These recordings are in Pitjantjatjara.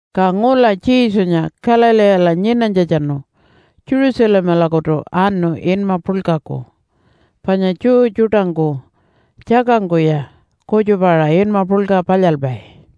Ka ngula Jesunya Galileela nyinanytjatjanu Jerusalemalakutu anu inma puḻkaku, panya Jew tjuṯangku tjakangkuya kutjupa-aṟa inma puḻka palyalpai.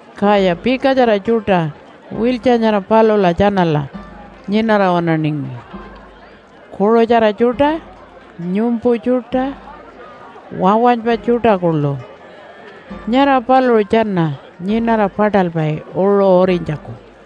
Kaya pikatjara tjuṯa wiltja nyara palula tjanala nyinara waṉaningi kuṟutjara tjuṯa, nyumpu tjuṯa, wawanypa tjuṯa kuḻu. Nyara paluṟu tjana nyinara paṯalpai uṟu urinytjaku.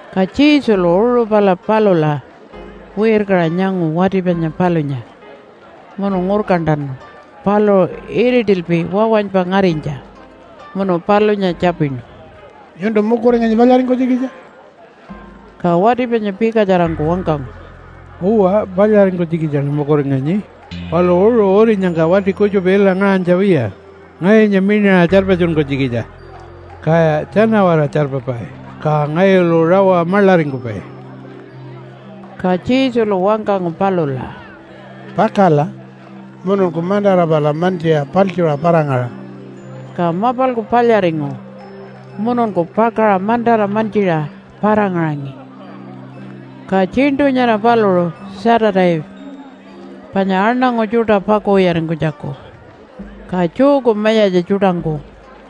Ka Jesulu uṟu pala palula wirkaṟa nyangu wati panya palunya munu ngurkantanu paluṟu iritilpi wawanypa ngarinytja. Munu palunya tjapinu, “Nyuntu mukuringanyi palyaringkunytjikitja?” Ka wati panya pikatjarangku wangkangu, “Uwa, palyaringkunytjikitjaṉa mukuringanyi, palu uṟu urinyangka wati kutjupa ila ngaṟanytja wiya ngayunya miṉaṟa tjarpatjunkunytjikitja. Kaya tjana-waraṟa tjarpapai, ka ngayulu rawa maḻaringkupai.” Ka Jesulu wangkangu palula, “Pakala! Mununku mantara pala mantjiṟa paḻtjuṟa para-ngaṟa.” Ka mapalku palyaringu mununku pakaṟa mantara mantjiṟa para-ngaṟangi. Ka tjiṉṯu nyara paluṟu Saturday panya aṉangu tjuṯa pakuwiyaringkunytjaku. Ka Jewku mayatja tjuṯangku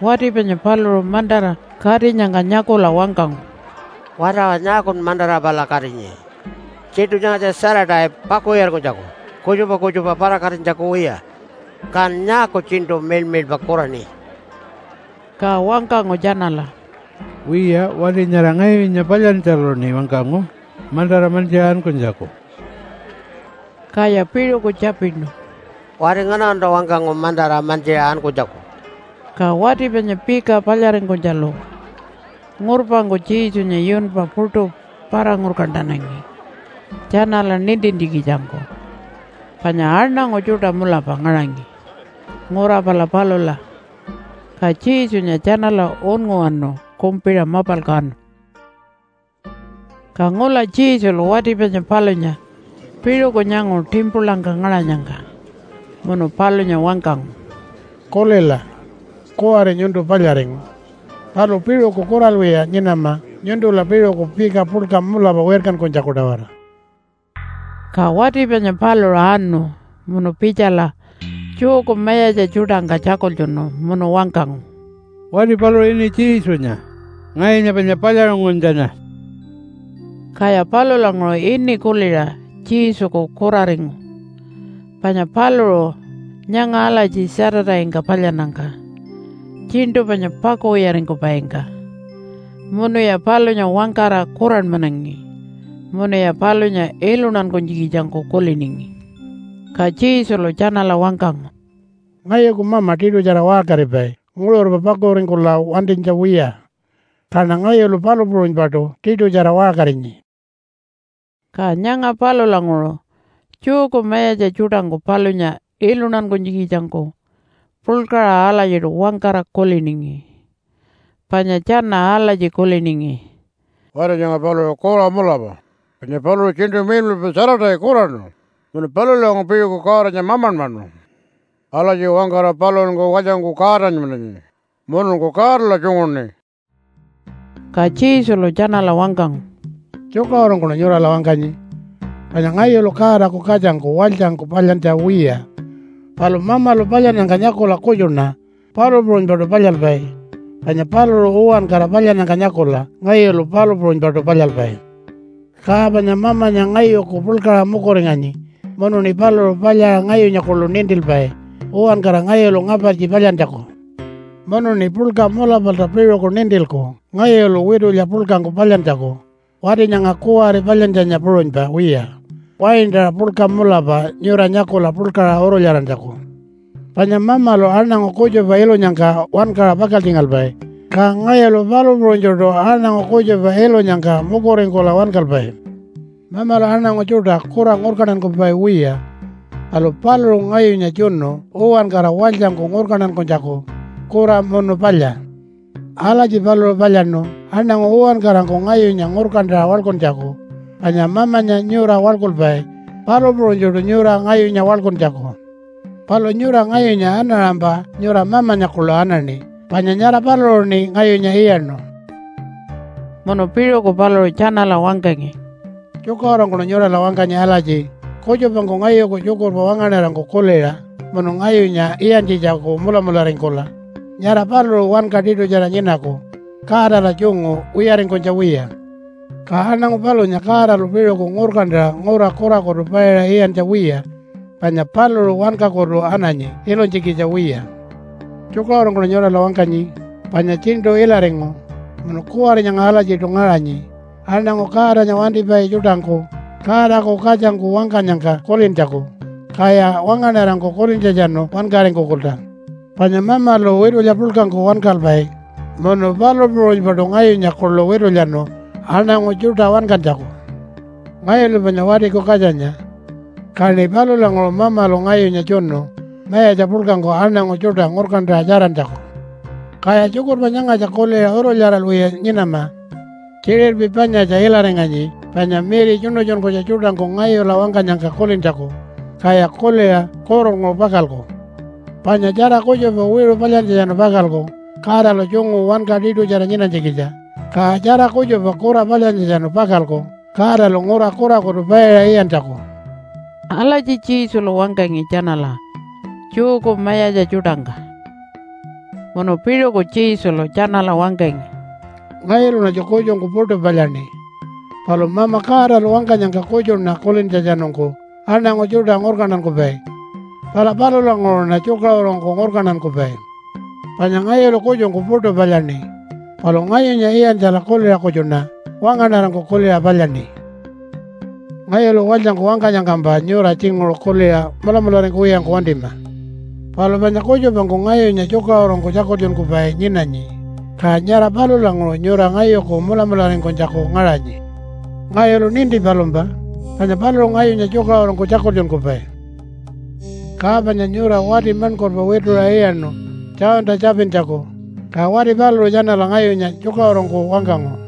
wati panya paluṟu mantara katinyangka nyakula wangkangu, “Wati awa! Nyaakun mantara pala katinyi? Tjiṉṯu nyangatja Saturday pakuwiyaringkunytjaku kutjupa kutjupa para-katinytjaku wiya. Kan nyaaku tjiṉṯu miḻmiḻpa kuraṉi?” Ka wangkangu tjanala, “Wiya, wati nyara ngayunya palyantjaluṉi wangkangu mantara mantjiṟa ankunytjaku.” Kaya piṟuku tjapinu, “Wati nganalunta wangkangu mantara mantjiṟa ankunytjaku?” Ka wati panya pika palyaringkunytjalu ngurpangku Jesunya yunpa puṯu para-ngurkantanangi tjanala nintintjikitjangku. Panya aṉangu tjuṯa mulapa ngaṟangi ngura pala palula, ka Jesunya tjanala unnguwanu kumpiṟa mapalku anu. Ka ngula Jesulu wati panya palunya piṟuku nyangu timpulangka ngaṟanyangka munu palunya wangkangu, “Kulila! Kuwari nyuntu palyaringu. Palu piṟuku kuralwiya nyinama nyuntula piṟuku pika puḻka mulapa wirkankunytjaku-tawara.” Ka wati panya paluṟu anu munu pitjala Jewku mayatja tjuṯangka tjakultjunu munu wangkangu, “Wati paluṟu ini Jesunya, ngayunya panya palyaṟunguntjanya.” Kaya palulanguṟu ini kuliṟa Jesuku kuraringu, panya paluṟu nyanga alatji Saturday-ngka palyannyangka tjiṉṯu panya pakuwiyaringkupaingka. Munuya palunya wangkara kuranmanangi munuya palunya iluntankunytjikitjangku kuliningi. Ka Jesulu tjanala wangkangu, “Ngayuku Mama tiṯutjara waṟkaripai nguṟurpa pakuringkula wantinytja wiya. Kaṉa ngayulu palu puṟunypaṯu tiṯutjara waṟkarinyi.” Ka nyanga palulanguṟu Jewku mayatja tjuṯangku palunya iluntankunytjikitjangku puḻkaṟa alatjiṯu wangkara kuliningi. Panya tjana alatji kuliningi, “Wati nyanga paluṟu kura mulapa, panya paluṟu tjiṉṯu miḻmiḻpa Saturday kuraṉu munu palulanguṟu piṟuku Godanya mamanmanu. Alatji wangkara paluṟunku walytjangku Godanmananyi mununku Godala tjunguṉi.” Ka Jesulu tjanala wangkangu, “Tjukaṟurungkuṉa nyurala wangkanyi. Panya ngayulu Godaku katjangku walytjangku palyantja wiya, palu Mamalu palyannyangka nyakula kutjuṉa palu puṟunypaṯu palyalpai. Panya paluṟu uwankara palyannyangka nyakula ngayulu palu puṟunypaṯu palyalpai. Ka panya Mamanya ngayuku puḻkaṟa mukuringanyi munuṉi paluṟu palyaṟa ngayunya kuḻu nintilpai uwankara ngayulu ngapartji palyantjaku. Munuṉi puḻka mulapalta piṟuku nintilku ngayulu witulya puḻkangku palyantjaku, wati nyanga kuwari palyantjanya puṟunypa wiya, waintaṟa puḻka mulapa, nyura nyakula puḻkaṟa urulyarantjaku. Panya Mamalu aṉangu kutjupa ilunyangka wankaṟa pakaltjingalpai, ka ngayulu palu puṟunytjuṯu aṉangu kutjupa ilunyangka mukuringkula wankalpai. Mamalu aṉangu tjuṯa kura ngurkantankupai wiya. Palu paluṟu ngayunya tjunu uwankara walytjangku ngurkantankunytjaku, kura munu palya. Alatji paluṟu palyaṉu aṉangu uwankarangku ngayunya ngurkantaṟa waḻkuntjaku, panya Mamanya nyura waḻkulpai, palu puṟunytjuṯu nyura ngayunya waḻkuntjaku. Palu nyura ngayunya anaṟampa nyura Mamanya kuḻu anaṉi panya nyara paluṟuṉi ngayunya iyaṉu.” Munu piṟuku paluṟu tjanala wangkangi, “Tjukaṟurungkuṉa nyurala wangkanyi alatji kutjupangku ngayuku tjukurpa wangaṉarangku kuliṟa munu ngayunya iyantjitjaku mulamularingkula nyara paluṟu wanka tiṯutjara nyinaku Godala tjungu wiyaringkunytja wiya. Ka aṉangu palunya Godalu piṟuku ngurkantaṟa ngura kurakutu paiṟa iyantja wiya, panya paluṟu wankakutu ananyi ilunytjikitja wiya. Tjukaṟurungkuṉa nyurala wangkanyi panya tjiṉṯu ilaringu munu kuwari nyanga alatjiṯu ngaṟanyi aṉangu Godanya wantipai tjuṯangku Godaku Katjangku wangkanyangka kulintjaku, kaya wangaṉarangku kulintjatjanu wankaringkukulta. Panya Mamalu witulya puḻkangku wankalpai, munu palu puṟunypaṯu ngayunya kuḻu witulyanu aṉangu tjuṯa wankantjaku. Ngayulu panya Watiku Katjanya. Kaṉi palulanguṟu Mamalu ngayunya tjunu mayatja puḻkangku aṉangu tjuṯa ngurkantaṟa tjarantjaku. Kaya tjukurpa nyangatja kuliṟa urulyaralwiya nyinama. Tjiṟirpi panyatja ilaringanyi, panya miri tjuṉutjunkunytja tjuṯangku ngayulu wangkanyangka kulintjaku, kaya kuliṟa kurulnguṟu pakalku. Panya tjara kutjupa wiṟu palyantjatjanu pakalku Godala tjungu wanka tiṯutjara nyinanytjikitja, ka tjara kutjupa kura palyantjatjanu pakalku Godalu ngura kurakutu paiṟa iyantjaku.” Alatji Jesulu wangkangi tjanala Jewku mayatja tjuṯangka. Munu piṟuku Jesulu tjanala wangkangi, “Ngayuluṉatju kutjungku puṯu palyaṉi. Palu Mama Godalu wangkanyangka kutjuṉa kulintjatjanungku aṉangu tjuṯa ngurkantankupai. Pala palulanguṟuṉa tjukaṟurungku ngurkantankupai. Panya ngayulu kutjungku puṯu palyaṉi, palu ngayunya iyantjala kuliṟa kutjuṉa wangaṉarangku kuliṟa palyaṉi. “Ngayulu walytjangku wangkanyangkampa nyura tjinguṟu kuliṟa mulamularingkuwiyangku wantima. Palu panya kutjupangku ngayunya tjukaṟurungku tjakultjunkupai nyinanyi, ka nyara palulanguṟu nyura ngayuku mulamularingkunytjaku ngaṟanyi. Ngayulu ninti palumpa, panya paluṟu ngayunya tjukaṟurungku tjakultjunkupai. “Ka panya nyura wati maṉkurpa wituṟa iyaṉu Johnta tjapintjaku, ka wati paluṟu tjanala ngayunya tjukaṟurungku wangkangu.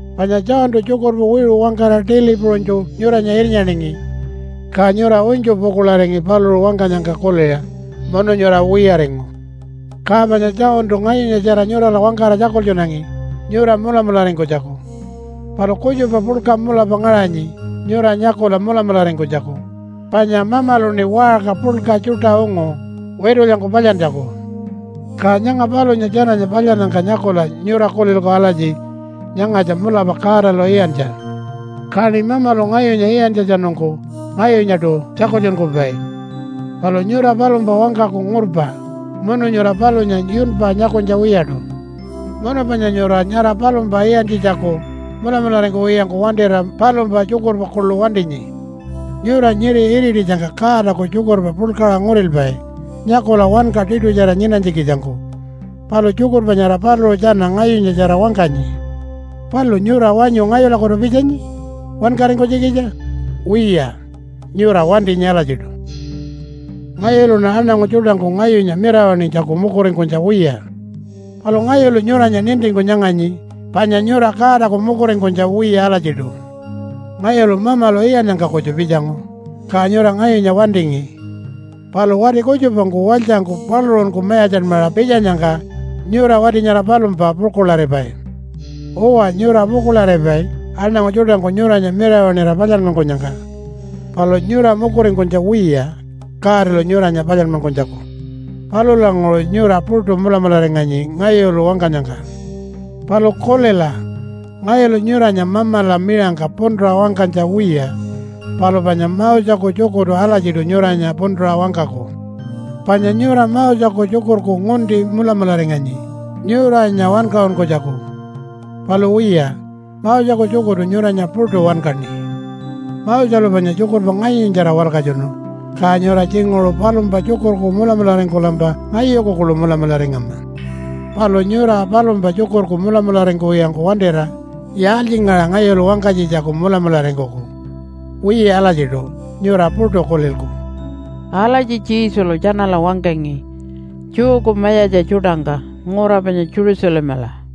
“Panya Johntu tjukurpa wiṟu wangkara tili puṟunytju nyuranya irnyaningi, ka nyura unytju pukuḻaringi paluṟu wangkanyangka kuliṟa munu nyura wiyaringu. Ka panya Johntu ngayunyatjara nyurala wangkara tjakultjunangi nyura mulamularingkunytjaku. Palu kutjupa puḻka mulapa ngaṟanyi nyura nyakula mulamularingkunytjaku, panya Mamaluṉi waṟka puḻka tjuṯa ungu witulyangku palyantjaku. Ka nyanga palunya tjananya palyannyangka nyakula nyura kulilku alatji, ‘Nyangatja mulapa Godalu iyantja.’ Kaṉi Mamalu ngayunya iyantjatjanungku ngayunyaṯu tjakultjunkupai. Palu nyura palumpa wangkaku ngurpa, munu nyura palunya yunpa nyakunytja wiyaṯu. Munu panya nyura nyara palumpa iyantjitjaku mulamularingkuwiyangku wantira palumpa tjukurpa kuḻu wantinyi. Nyura nyiri irititjangka Godaku tjukurpa puḻkaṟa ngurilpai nyakula wanka tiṯutjara nyinanytjikitjangku. Palu tjukurpa nyara paluṟu tjana ngayunyatjara wangkanyi. Palu nyura wanyu ngayulakutu pitjanyi wankaringkunytjikitja? Wiya, nyura wantinyi alatjiṯu. “Ngayuluṉa aṉangu tjuṯangku ngayunya mirawaṉinytjaku mukuringkunytja wiya. Palu ngayulu nyuranya nintingku nyanganyi, panya nyura Godaku mukuringkunytja wiya alatjiṯu. Ngayulu Mamalu iyannyangka kutju pitjangu, ka nyura ngayunya wantingi. Palu wati kutjupangku walytjangku paluṟunku mayatjanmaṟa pitjanyangka nyura wati nyara palumpa pukuḻaripai. Uwa, nyura pukuḻaripai aṉangu tjuṯangku nyuranya mirawaṉira palyanmankunyangka. Palu nyura mukuringkunytja wiya Godalu nyuranya palyanmankunytjaku. Palulanguṟu nyura puṯu mulamularinganyi ngayulu wangkanyangka. Palu kulila, ngayulu nyuranya Mamala miṟangka puntuṟa wangkanytja wiya. Palu panya Moseku tjukurtu alatjiṯu nyuranya puntuṟa wangkaku. Panya nyura Moseku tjukurku ngunti mulamularinganyi nyuranya wankaṟunkunytjaku. Palu wiya, Moseku tjukurtu nyuranya puṯu wankaṉi. Moselu panya tjukurpa ngayunyatjara walkatjunu, ka nyura tjinguṟu palumpa tjukurku mulamularingkulampa ngayuku kuḻu mulamularingama. Palu nyura palumpa tjukurku mulamularingkuwiyangku wantira yaaltjingaṟa ngayulu wangkanytjitjaku mulamularingkuku? Wiya alatjiṯu, nyura puṯu kulilku.” Alatji Jesulu tjanala wangkangi Jewku mayatja tjuṯangka ngura panya Jerusalemala.